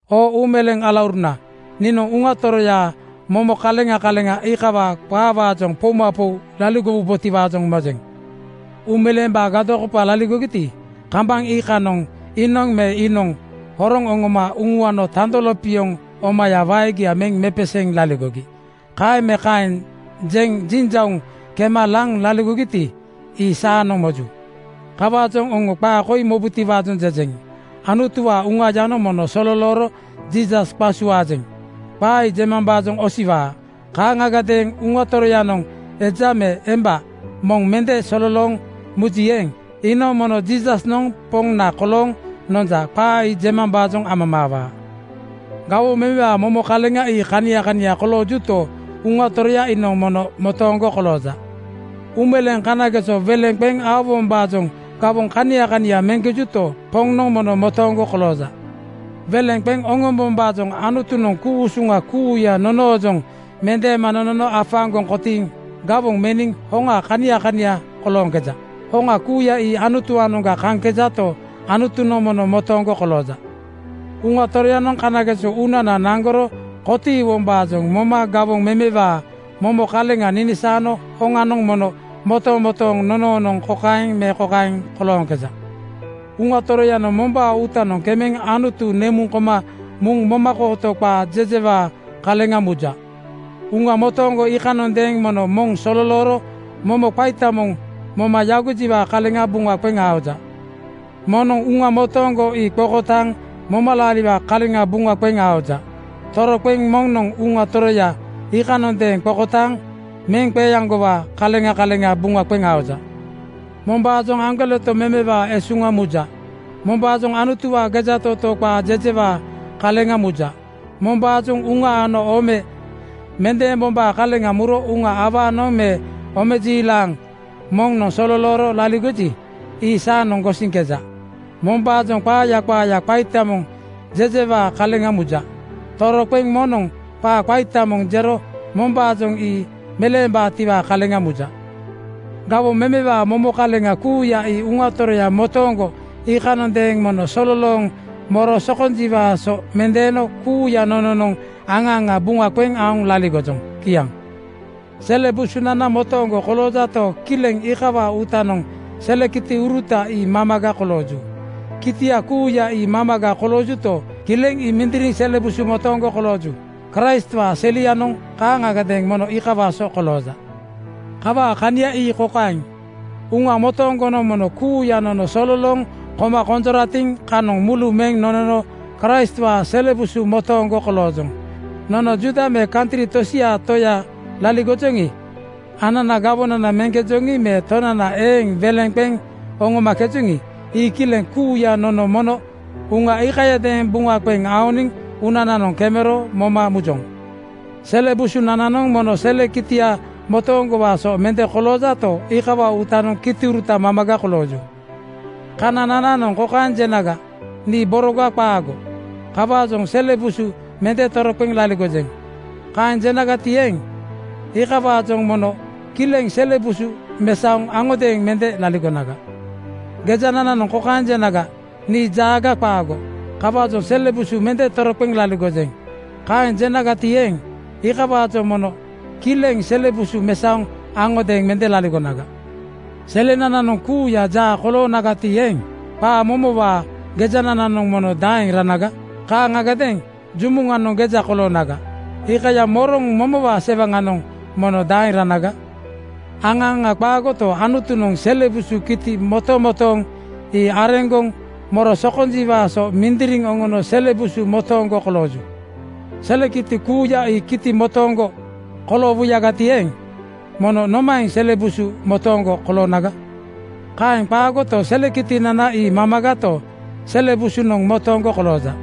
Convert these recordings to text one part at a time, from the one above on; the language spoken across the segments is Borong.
Oo uumeleeŋ alauruna, niinoŋ Uŋa Toroyaa momo kaleŋa kaleŋa iikawaa qaawaajoŋ poumapou laligowubotiwaajoŋ mojeŋ. Uumeleembaa gadokopa laligogiti, kambaŋ iikanoŋ iinoŋ me iinoŋ horoŋ oŋoma uŋuano tando lopioŋ omaya waegia meŋ mepeseeŋ laligogi. Kaeŋ me kaeŋ jeŋ jinjauŋ kema laŋ laligogiti, ii saanoŋ moju. Kawaajoŋ oŋo qaa koi mobutiwaajoŋ jejeŋ: Anutuwaa Uŋayanoŋ moŋ sololooro “Jiisas qasuaajeŋ,” qaa ii jemambaajoŋ osiwaa. Kaaŋagadeeŋ Uŋa Toroyanoŋ eja me emba moŋ mende sololooŋ muji eeŋ, iinoŋ mono “Jiisasnoŋ Poŋna kolooŋ nonja,” qaa ii jemambaajoŋ amamaawaa. Gawoŋ memewaa momo kaleŋa ii kania kania koloojuto, Uŋa Toroya iinoŋ mono motooŋgo kolooja. Uumeleeŋ kanageso weleŋ qeŋ oŋombombaajoŋ gawoŋ kania kania meŋkejonto, Poŋnoŋ mono motooŋgo kolooja. Weleŋ qeŋ oŋombombaajoŋ Anutunoŋ ku-usuŋa kuuya nonoojoŋ mendeema nonono afaaŋgoŋ kotiiŋ gawoŋ meniŋ hoŋa kania kania kolooŋkeja. Hoŋa kuuya ii Anutuwaanoŋga kaŋkejato, Anutunoŋ mono motooŋgo kolooja. Uŋa Toroyanoŋ kanageso uunana naŋgoro kotiiwombaajoŋ moma gawoŋ memewaa momo kaleŋa ninisaano hoŋanoŋ mono motomotooŋ nonoonoŋ kokaeŋ me kokaeŋ kolooŋkeja: Uŋa Toroyanoŋ mombaa uutanoŋ kemeŋ Anutu nemuŋ koma muŋ momakooto qaa jejewaa kaleŋa muja. Uŋa motooŋgo iikanondeeŋ mono moŋ sololooro momo qaita moŋ moma yagojiwaa kaleŋa buŋa qeŋ aoja. Moŋnoŋ Uŋa motooŋgo ii qokotaaŋ momalaariwaa kaleŋa buŋa qeŋ aoja. Toroqeŋ moŋnoŋ Uŋa Toroya iikanondeeŋ qokotaaŋ meŋ qeeaŋgowaa kaleŋa kaleŋa buŋa qeŋ aoja. Mombaajoŋ aŋgoleto memewaa esuŋa muja. Mombaajoŋ Anutuwaa gejatootoo qaa jejewaa kaleŋa muja. Mombaajoŋ uŋa ano ome mendeembombaa kaleŋa muro uŋa awaanoŋ me omejiilaŋ moŋnoŋ sololooro laligoji, ii saanoŋ gosiŋkeja. Mombaajoŋ qaaya qaaya qaita moŋ jejewaa kaleŋa muja. Toroqeŋ moŋnoŋ qaa qaita moŋ jero mombaajoŋ ii meleembaatiwaa kaleŋa muja. Gawoŋ memewaa momo kaleŋ kuuya ii Uŋa Toroyamotooŋgo iikanondeeŋ mono sololooŋ moro sokonjiwaa so mendeeno kuuya nononoŋ aŋa aŋa buŋa qeŋ aoŋ laligojoŋ. Kiaŋ. Sele busunana motooŋgo koloojato, kileŋ iikawaa uutanoŋ sele kitiuruta ii mamaga kolooju. Kitia kuuya ii mamaga koloojuto, kileŋ ii mindiriŋ sele busu motooŋgo kolooju. Kraistwaa selianoŋ kaaŋagadeeŋ mono iikawaa so kolooja. Kawaa kania ii kokaeŋ: Uŋa motooŋgonoŋ mono kuuya nono sololooŋ koma konjoratiŋ kanoŋ mulu meŋ nonono Kraistwaa sele busu motooŋgo koloojoŋ. Nono Juuda me kantri tosiaa toya laligojoŋi, ananaa gawonana meŋkejoŋi me tonana eeŋ weleŋ qeŋ oŋomakejoŋi, ii kileŋ kuuya nono mono Uŋa iikayadeeŋ buŋa qeŋ aoniŋ uunananoŋ kemero moma mujoŋ. Sele busunananoŋ mono sele kitia motooŋgowaa so mende koloojato, iikawaa uutanoŋ kitiuruta mamaga kolooju. Kananananoŋ kokaeŋ jenaga, “Nii boroga qaago. Kawaajoŋ sele busu mende toroqeŋ laligojeŋ.” Kaeŋ jenagati eeŋ, iikawaajoŋ mono kileŋ sele busu mesaoŋ aŋodeeŋ mende laligonaga. Gejanananoŋ kokaeŋ jenaga, “Nii jaaga qaago. Kawaajoŋ sele busu mende toroqeŋ laligojeŋ.” Kaeŋ jenagati eeŋ, iikawaajoŋ mono kileŋ sele busu mesaoŋ aŋodeeŋ mende laligonaga. Selenananoŋ kuuya jaa koloonagati eeŋ, qaa momowaa gejanananoŋ mono daeŋ ranaga? Kaaŋagadeeŋ jumuŋanoŋ geja koloonaga, iikaya moroŋ momowaa sewanananoŋ mono daeŋ ranaga? Aŋa aŋa qaagoto, Anutunoŋ sele busu kiti motomotooŋ ii areŋgoŋ moro sokonjiwaa so mindiriŋ oŋono sele busu motooŋgo kolooju. Sele kiti kuuya ii kiti motooŋgo koloowuyagati eeŋ, mono nomaeŋ sele busu motooŋgo koloonaga? Kaeŋ qaagoto, sele kitinana ii mamagato, sele busunoŋ motooŋgo kolooja.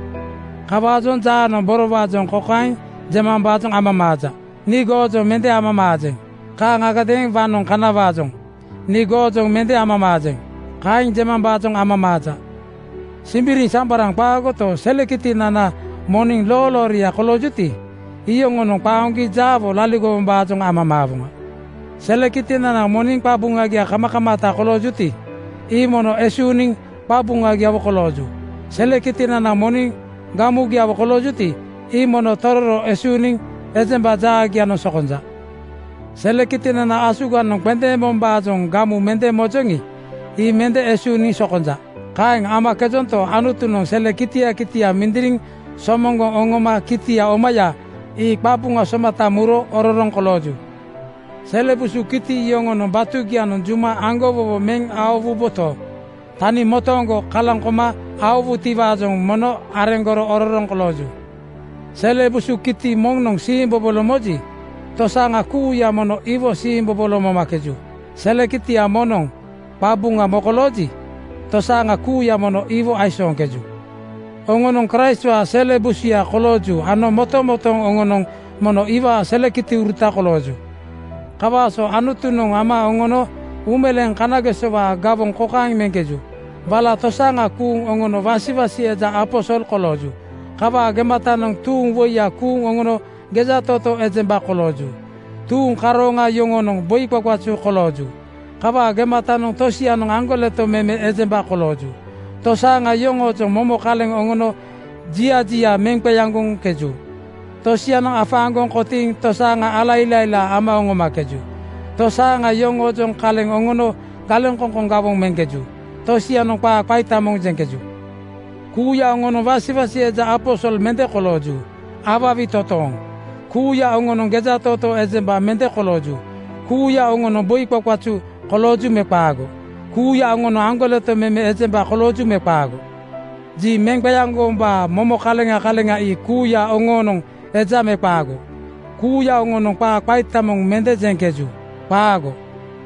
Kawaajoŋ jaanoŋ borowaajoŋ kokaeŋ jemambaajoŋ amamaaja, “Nii goojoŋ mende amamaajeŋ.” Kaaŋagadeeŋ waŋnoŋ kanawaajoŋ “Nii goojoŋ mende amamaajeŋ,” kaeŋ jemambaajoŋ amamaaja. Simbiriŋsambaraŋ qaagoto, sele kitinana moniŋ loolooria koloojuti, iyoŋonoŋ qaoŋgi jaawo laligowombaajoŋ amamaawoŋa. Sele kitinana moniŋ qabuŋagia kamakamaata koloojuti, ii mono esuuniŋ qabuŋagiawo kolooju. Sele kitinana moniŋ gamugiawo koloojuti, ii mono tororo esuuniŋ ejemba jaagianoŋ sokonja. Sele kitinana asuganoŋ qendeembombaajoŋ gamu mende mojoŋi, ii mende esuuniŋ sokonja. Kaeŋ amakejonto, Anutunoŋ sele kitia kitia mindiriŋ somoŋgoŋ oŋoma kitia omaya ii qabuŋa somata muro ororoŋ kolooju. Sele busu kiti yoŋonoŋ batugianoŋ juma aŋgowowo meŋ aowuboto, tani motooŋgo kalaŋ koma aowutiwaajoŋ mono areŋgoro ororoŋ kolooju. Sele busu kitia moŋnoŋ siimbobolo moji, tosaaŋa kuuya mono iwo siimbobolo momakeju. Sele kitia moŋnoŋ qabuŋa mokolooji, tosaaŋa kuuya mono iwo aisooŋkeju. Oŋonoŋ Kraistwaa sele busuya kolooju ano motomotooŋ oŋonoŋ mono iwaa sele kitiuruta kolooju. Kawaa so Anutunoŋ ama oŋono uumeleeŋ kanagesowaa gawoŋ kokaeŋ meŋkeju: Wala tosaaŋa kuuŋ oŋono wasiwasi eja aposol kolooju. Kawaa gematanoŋ tuuŋ woiya kuuŋ oŋono gejatootoo ejemba kolooju. Tuuŋ karooŋa yoŋonoŋ boi qaqazu kolooju. Kawaa gematanoŋ tosianoŋ aŋgoleto meme ejemba kolooju. Tosaaŋa yoŋoojoŋ momo kaleŋ oŋono jia jia meŋ qeaŋgoŋkeju. Tosianoŋ afaaŋgoŋ kotiiŋ tosaaŋa ala ilailaa ama oŋomakeju. Tosaaŋa yoŋoojoŋ kaleŋ oŋono galeŋkoŋkoŋ gawoŋ meŋkeju. Tosianoŋ qaa qaita moŋ jeŋkeju. Kuuya oŋonoŋ wasiwasi eja aposol mende kolooju. Awawi totooŋ! Kuuya oŋonoŋ gejatootoo ejemba mende kolooju. Kuuya oŋonoŋ boi qaqazu kolooju me qaago? Kuuya oŋonoŋ aŋgoleto meme ejemba kolooju me qaago? Ji meŋ qeaŋgowombaa momo kaleŋa kaleŋa ii kuuya oŋoonoŋ eja me qaago? Kuuya oŋonoŋ qaa qaita moŋ mende jeŋkeju. Qaago.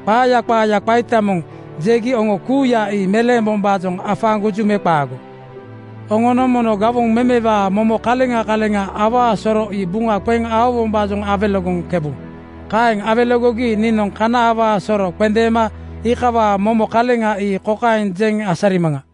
Qaaya qaaya qaita moŋ jegi oŋo kuuya ii meleembombaajoŋ afaaŋgoju me qaago? Oŋonoŋ mono gawoŋ memewaa momo kaleŋa kaleŋa awaa soro ii buŋa qeŋ aowombaajoŋ awelegoŋkebu. Kaeŋ awelegogi niinoŋ kana awaa soro qendeema iikawaa momo kaleŋa ii kokaeŋ jeŋ asarimaŋa: